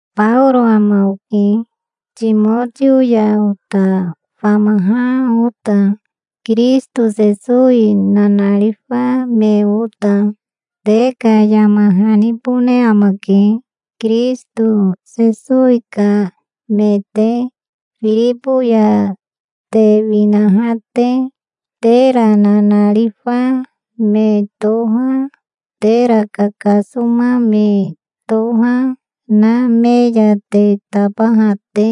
Baoro ama oke, Timotio ya ota famaha ota, Kirisito Sesowi nanarifa me ota. Te ka yama hanibone amake, Kirisito Sesowi ka me te, Firibo ya te winaha te, tera nanarifa me toha, tera kakasoma me toha na me ya te tabaha te.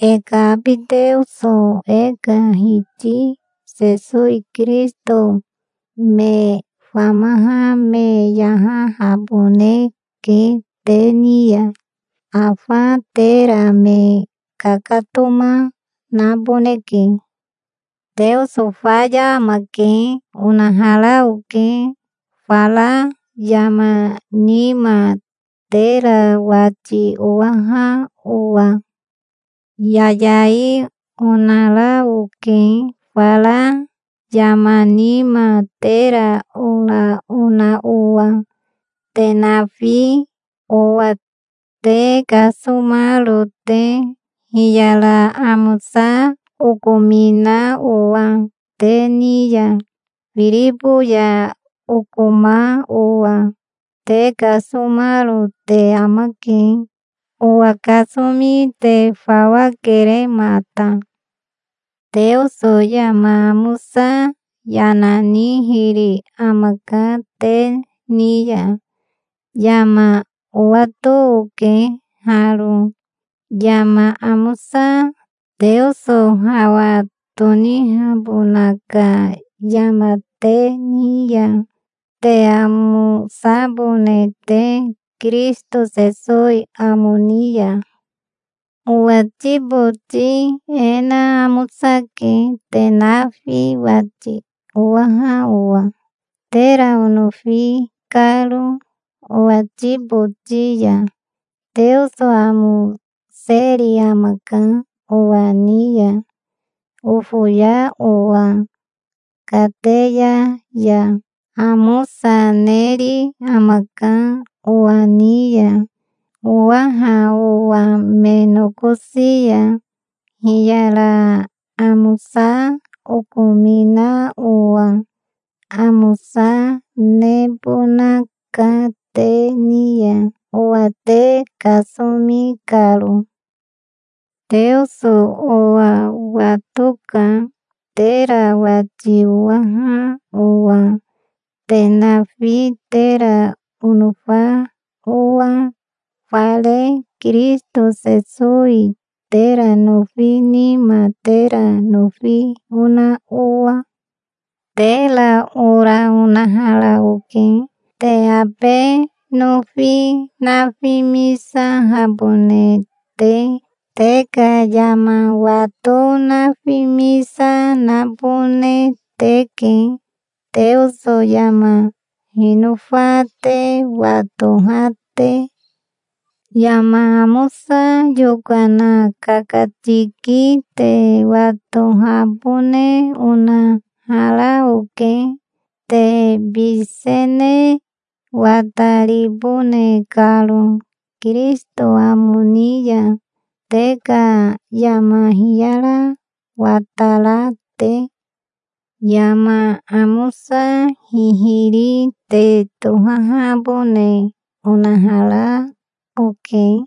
E ka abi Teoso e ka Hiti Sesowi Kirisito me famaha me yahahaboneke te ni ya. Afa tera me kakatoma naboneke. "Teoso faya amake", onahara oke, fara yama nima, tera wati owaha owa. Yayai onara oke fara yama nima, tera ora ona owa, te nafi, owa te kasomaro te, hiyara amosa okomina owa te ni ya. Firibo ya okoma owa te kasomaro te amake. Owa kasomi te fawa kere mata. Teoso yama amosa yana nihiri amaka te ni ya. Yama owato oke haro, yama amosa Teoso hawa tonihabona ka yama te ni ya, te amosabone te Kirisito Sesowi amo ni ya. Owati boti e na amosake, te nafi wati owaha owa, tera onofi karo owati boti ya. Teoso amoseri amaka owa ni ya, ofoya owa kateya ya. Amosa neri amaka owa ni ya, owaha owa me nokosi ya, hiyara amosa okomina owa. Amosa nebonaka te ni ya, owa te kasomi karo. Teoso owa watoka, tera wati owaha owa, te nafi, tera onofa owa, fare Kirisito Sesowi tera nofi nima tera nofi ona owa. Tera ora onahara oke, te abe nofi nafimisahabone te. Te ka yama wato nafimisa nabone teke, Teoso yama hinofa te watoha te. Yama amosa yokana kakatiki te watohabone onahara oke, te bisene wataribone karo Kirisito amo ni ya, te ka yama hiyara watara te. Yama amosa hihiri te tohahabone onahara oke,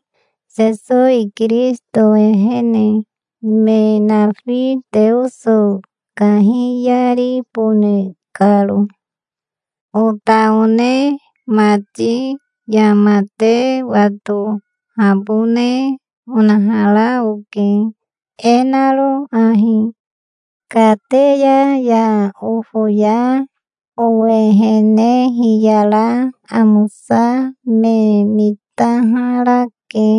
Sesowi Kirisito ehene, me nafi Teoso kahiyaribone karo. Ota one mati, yama te watohabone onahara oke, e naro ahi: kateya ya ofoya owehene hiyara amosa me mitaharake,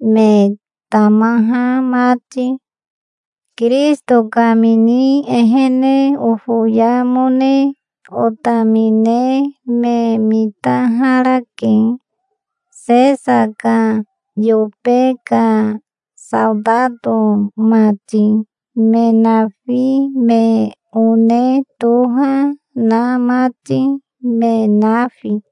me tamaha mati. Kirisito kamini ehene ofoyamone otamine me mitaharake, Sesa ka yobe ka saotato mati, me nafi, me one toha na mati, me nafi.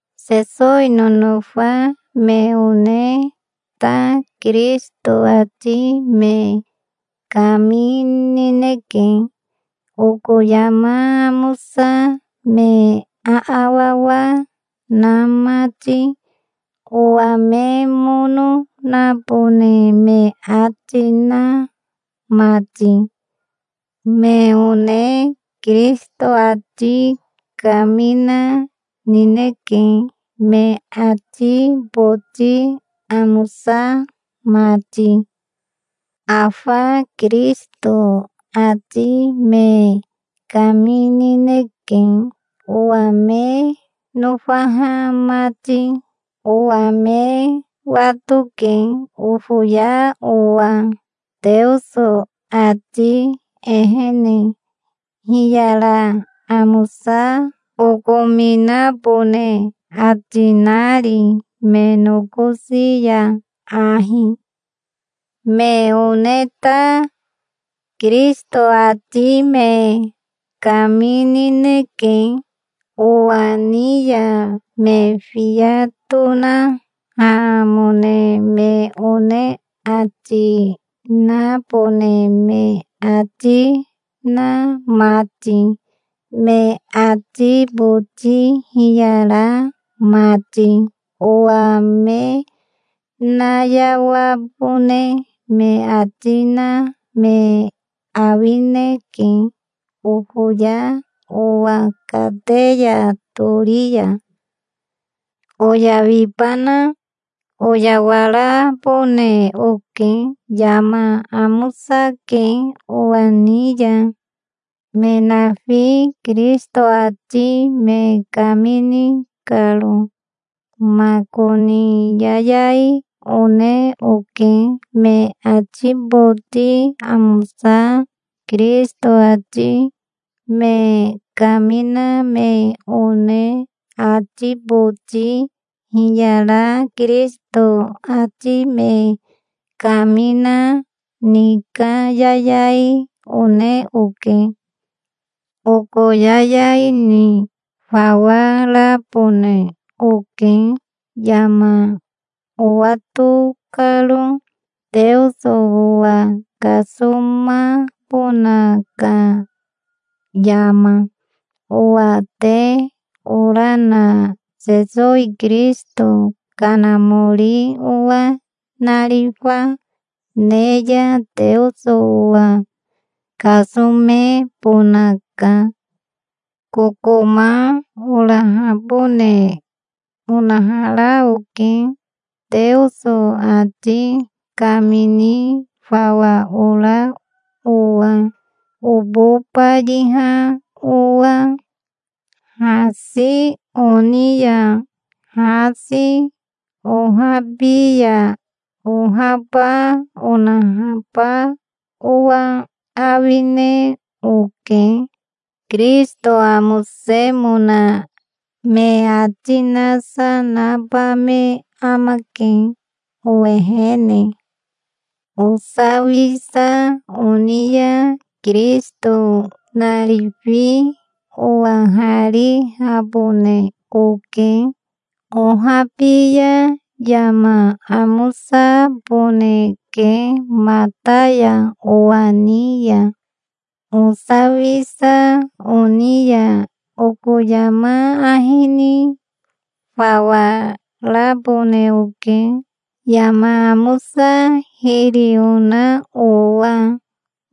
Sesowi nonofa me one ta Kirisito ati me kaminineke, oko yama amosa me aawawa na mati, owa me mono nabone me ati na mati. Me one Kirisito ati kamina nineke, me ati boti amosa mati. Afa Kirisito ati me kaminineke, owa me nofaha mati. Owa me watoke, ofoya owa Teoso ati ehene, hiyara amosa okominabone ati nari me nokosi ya ahi. Me one ta Kirisito ati me kaminineke, owa ni ya me fiya tonahamone me one ati nabone me ati na mati, me ati boti hiyara mati. Owa me nayawabone me ati na me awineke, ofoya owa kateya tori ya. Oyawibana? Oyawarabone oke. Yama amosake owa ni ya, me nafi Kirisito ati me kamini karo. Makoni yayai one oke. Me ati boti amosa Kirisito ati me kamina me one ati boti hiyara Kirisito ati me kamina ni ka yayai one oke. Oko yayai ni fawa rabone oke, yama owato karo, Teoso owa kasomabona ka yama. Owa te ora na Sesowi Kirisito Kanamori owa narifa ne ya Teoso owa kasomebonaka. Kokoma orahabone onahara oke, Teoso ati kamini fawa ora owa, obo bayiha owa. Hasi oni ya hasi, ohabi ya ohaba onahaba owa awine oke. Kirisito amosemona me ati nasa naba me amake owehene. Osawisa oni ya Kirisito narifi owaharihabone oke. Ohabi ya yama amosaboneke mata ya owa ni ya. Osawisa oni ya oko yama ahi ni fawa rabone oke, yama amosa hiri ona owa.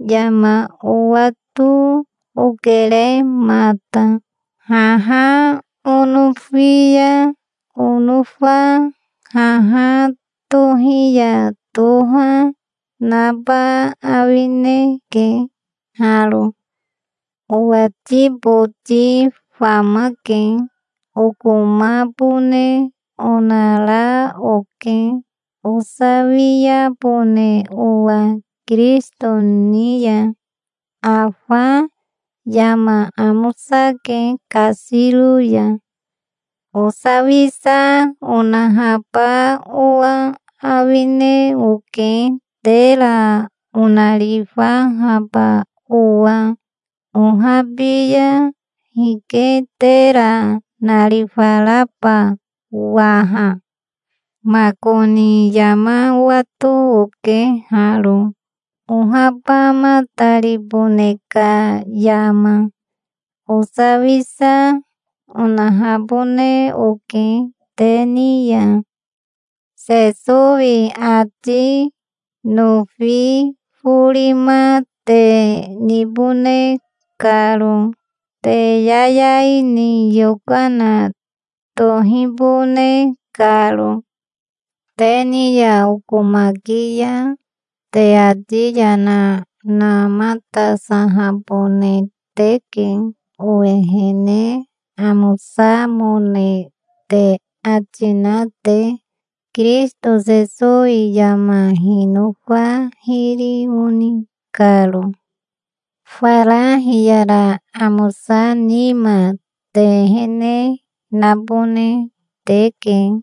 Yama owato okere mata. Haha onofi ya onofa, haha tohi ya toha naba awineke haro. Owati boti famake. Okomabone onara oke, osawiabone owa Kirisito ni ya. Afa yama amosake kasiro ya. Osawisa onahaba owa awine oke, tera onarifahaba owa. Ohabi ya hike tera narifaraba waha? Makoni yama owato oke haro, ohabamataribone ka yama. Osawisa onahabone oke te ni ya, Sesowi ati nofi forima te nibone karo, te yayai ni yokana tohibone karo. Te ni ya okomaki ya, te ati yana namatasahabone teke, owehene amosamone te ati na te, Kirisito Sesowi yama hinofa hiri oni karo. Fara hiyara amosa nima te ehene nabone teke,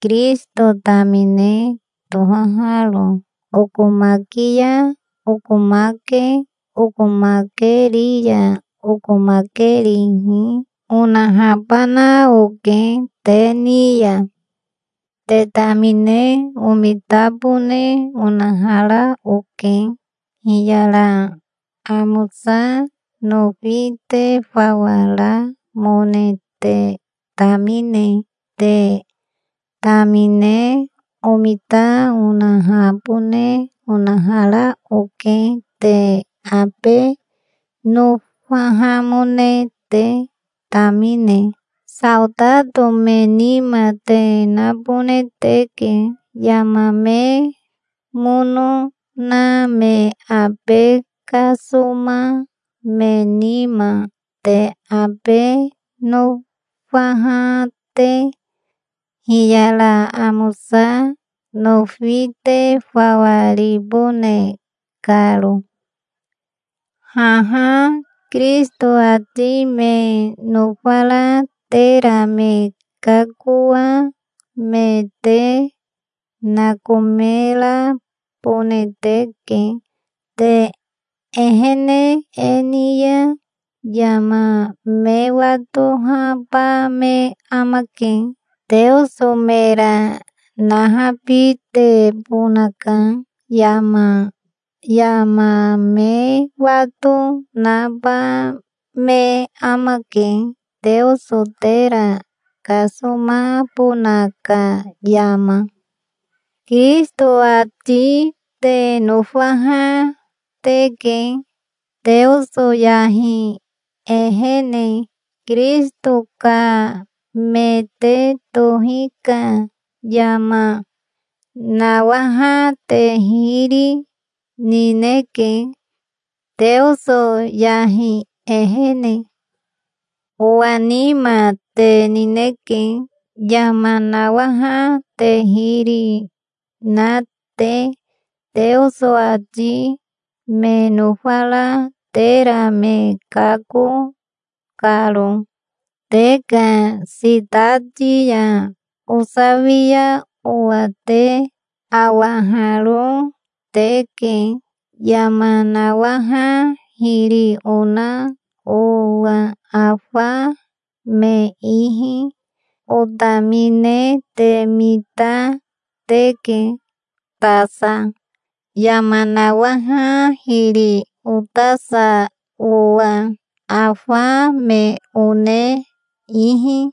Kirisito tamine tohaharo. Okomaki ya okomake, okomakeri ya okomakerihi onahabana oke te ni ya. Te tamine omitabone onahara oke, hiyara amosa nofi te fawa ramone te tamine. Te tamine omita onahabone onahara oke, te abe nofahamone te tamine. Saotato me nima te nabone teke yama me mono na me abe kasoma me nima, te abe nofaha te, hiyara amosa nofi te fawa ribone karo. Haha Kirisito ati me nofara tera me kakoa me te nakomerabone teke. Te ehene e ni ya yama me watohaba me amake, Teoso mera nahabitebona ka yama. Yama me wato naba me amake, Teoso tera kasomabona ka yama. Kirisito ati te nofaha teke, Teoso yahi ehene. Kirisito ka me te tohi ka yama nawaha te hiri, nineke, Teoso yahi ehene. Owa nima te nineke, yama nawaha te hiri na te, Teoso ati me nofara tera me kako karo. Te ka sitati ya osawia owa te awaharo teke, yama nawaha hiri ona owa afa me ihi. Otamine te mita teke tasa, yama nawaha hiri otasa owa, afa me one ihi.